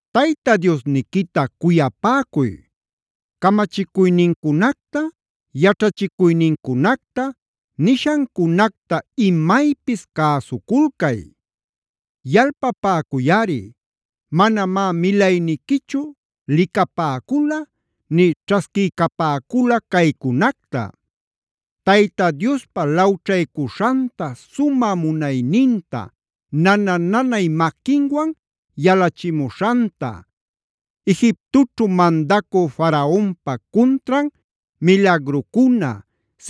“Tayta Diosniquita cuyapäcuy; camachicuynincunacta, yaćhachicuynincunacta, nishancunacta imaypis cäsuculcay. Yalpapäcuyꞌari, manamá milayniquichu licapäcula, nï ćhasquiycapäcula caycunacta: Tayta Diospa lawćhaycuśhanta, sumä munayninta, nana-nanay maquinwan yalachimuśhanta, Egiptoćhu mandacü Faraonpa cuntran milagrucuna,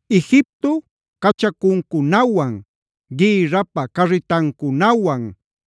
Egipto cachacuncunawan, gïrrapä carritancunawan,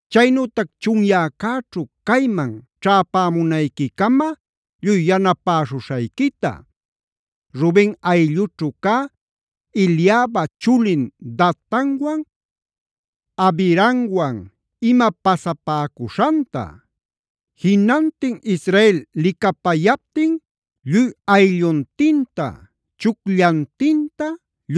chaynütac chunyäcäćhu cayman ćhäpämunayquicama lluy yanapäśhuśhayquita, Ruben ayllućhu cä Eliaba chulin Datanwan Abiramwan ima pasapäcuśhanta; jinantin Israel licapayaptin lluy aylluntinta, chucllantinta,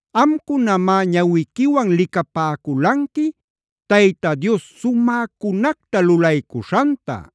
Amcunamá ñawiquiwan licapäculanqui Tayta Dios sumäcunacta lulaycuśhanta.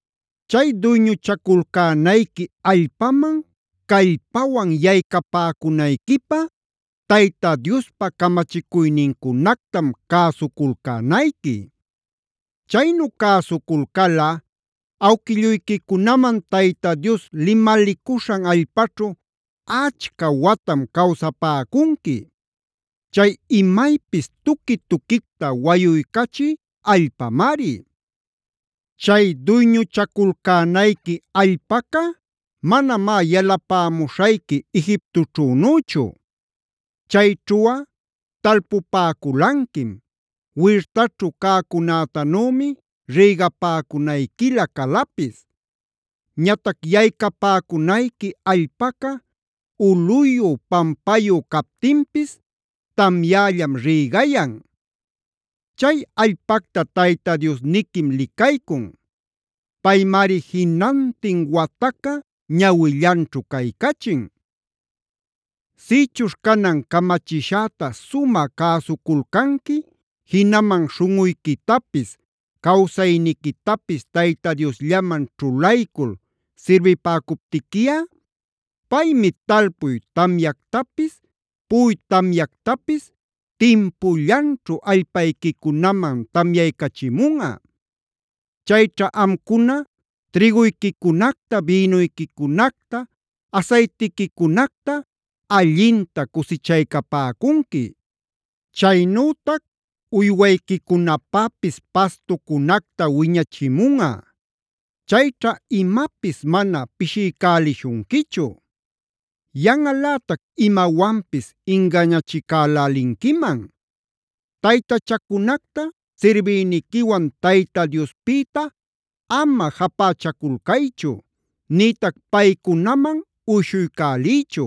“Chay duyñuchaculcänayqui allpaman callpawan yaycapäcunayquipä Tayta Diospa camachicuynincunactam cäsuculcänayqui. Chaynu cäsuculcalꞌa awquilluyquicunaman Tayta Dios limalicuśhan allpaćhu achca watam cawsapäcunqui; chay imaypis tuqui-tuquicta wayuycachï allpamari. Chay duyñuchaculcänayqui allpaca manamá yalapämuśhayqui Egiptoćhünüchu. Chayćhuꞌa talpupäculanquim; wirtaćhu cäcunätanümi rïgapäcunayquila calapis. Ñatac yaycapäcunayqui allpaca ulꞌuyu, pampayu captinpis tamyällam rïgayan. Chay allpacta Tayta Diosniquim licaycun; Paymari jinantin wataca ñawillanćhu caycachin. “Sïchuśh canan camachishäta sumä cäsuculcanqui, jinaman śhunꞌuyquitapis, cawsayniquitapis Tayta Diosllaman ćhulaycul sirbipäcuptiquiꞌa, paymi talpuy tamyactapis puꞌuy tamyactapis timpullanćhu allpayquicunaman tamyaycachimunꞌa. Chayćha amcuna trïguyquicunacta, bïnuyquicunacta, asaytiquicunacta allinta cusichaycapäcunqui. Chaynütac uywayquicunapäpis pastucunacta wiñachimunꞌa. Chayćha imapis mana pishiycälishunquichu. Yanꞌalätac imawanpis ingañachicälälinquiman. Taytachacunacta sirbiyniquiwan Tayta Diospïta ama japächaculcaychu, nïtac paycunaman uyshuycäliychu.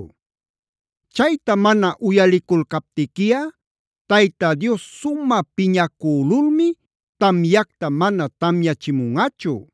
Chayta mana uyaliculcaptiquiꞌa Tayta Dios sumä piñacülulmi tamyacta mana tamyachimunꞌachu.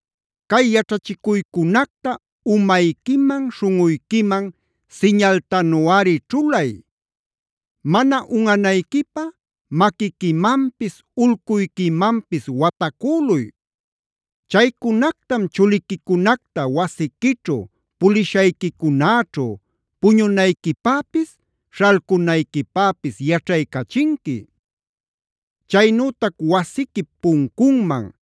“Cay yaćhachicuycunacta umayquiman, śhunꞌuyquiman siñaltanuꞌari ćhulay; mana unꞌanayquipä maquiquimanpis ulcuyquimanpis watacüluy. Chaycunactam chuliquicunacta wasiquićhu, pulishayquicunäćhu, puñunayquipäpis, śhalcunayquipäpis yaćhaycachinqui. Chaynütac wasiquip puncunman,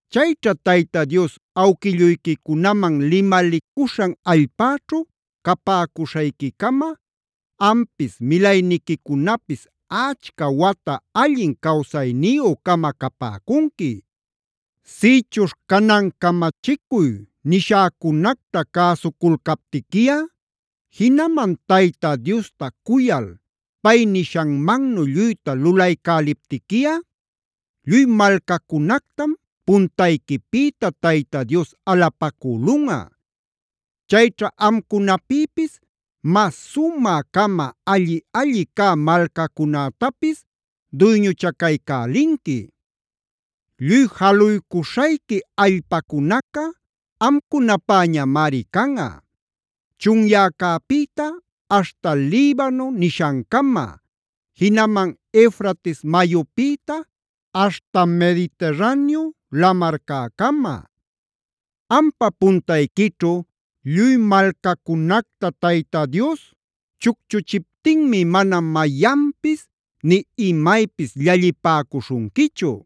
Chayćha Tayta Dios awquilluyquicunaman limalicuśhan allpäćhu capäcuśhayquicama ampis, milayniquicunapis achca wata allin cawsayniyü-cama capäcunqui. “Sïchuśh canan camachicuy nishäcunacta cäsuculcaptiquiꞌa, jinaman Tayta Diosta cuyal pay nishanmannu lluyta lulaycäliptiquiꞌa, lluy malcacunactam puntayquipïta Tayta Dios alapacülunꞌa. Chayćha amcunapïpis mas sumä-cama, alli-alli cä malcacunätapis duyñuchacaycälinqui. Lluy jaluycuśhayqui allpacunaca amcunapäñamari canꞌa: chunyäcäpïta aśhta Libano nishancama; jinaman Eufrates mayupïta aśhta Mediterraneo lamarcäcama. Ampa puntayquićhu lluy malcacunacta Tayta Dios chucchuchiptinmi mana mayanpis nï imaypis llallipäcuśhunquichu.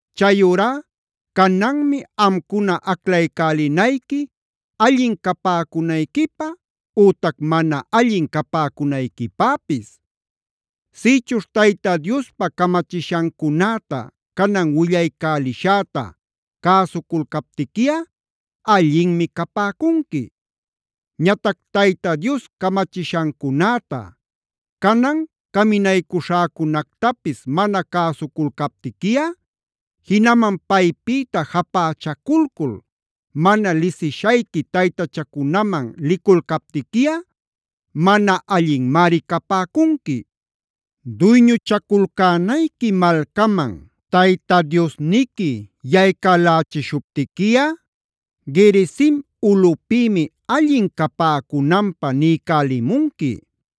“Chayurá cananmi amcuna aclaycälinayqui allin capäcunayquipä ütac mana allin capäcunayquipäpis. Sïchuśh Tayta Diospa camachishancunäta canan willaycälishäta cäsuculcaptiquiꞌa allinmi capäcunqui. Ñatac Tayta Dios camachishancunäta, canan caminaycuśhäcunactapis mana cäsuculcaptiquiꞌa, jinaman paypïta japächaculcul mana lisishayqui taytachacunaman liculcaptiquiꞌa mana allinmari capäcunqui. “Duyñuchaculcänayqui malcaman Tayta Diosniqui yaycälächishuptiquiꞌa Gerizim ulꞌupïmi allin capäcunanpä niycälimunqui;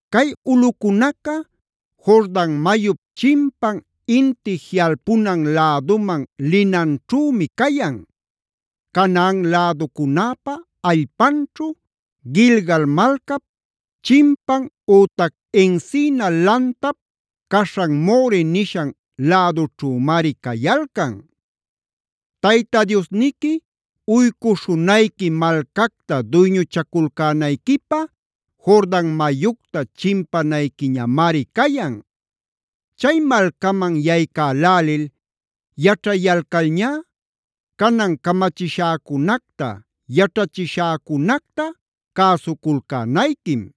Cay ulꞌucunaca Jordan mayup chimpan inti jiꞌalpunan läduman linanćhümi cayan; Canaan läducunäpä allpanćhu, Gilgal malcap chimpan ütac encina lantap caśhan More nishan lädućhümari cayalcan. Tayta Diosniqui uycuśhunayqui malcacta duyñuchaculcänayquipä Jordan mayucta chimpanayquiñamari cayan. Chay malcaman yaycälälil yaćhayalcalñá, canan camachishäcunacta, yaćhachishäcunacta cäsuculcänayquim.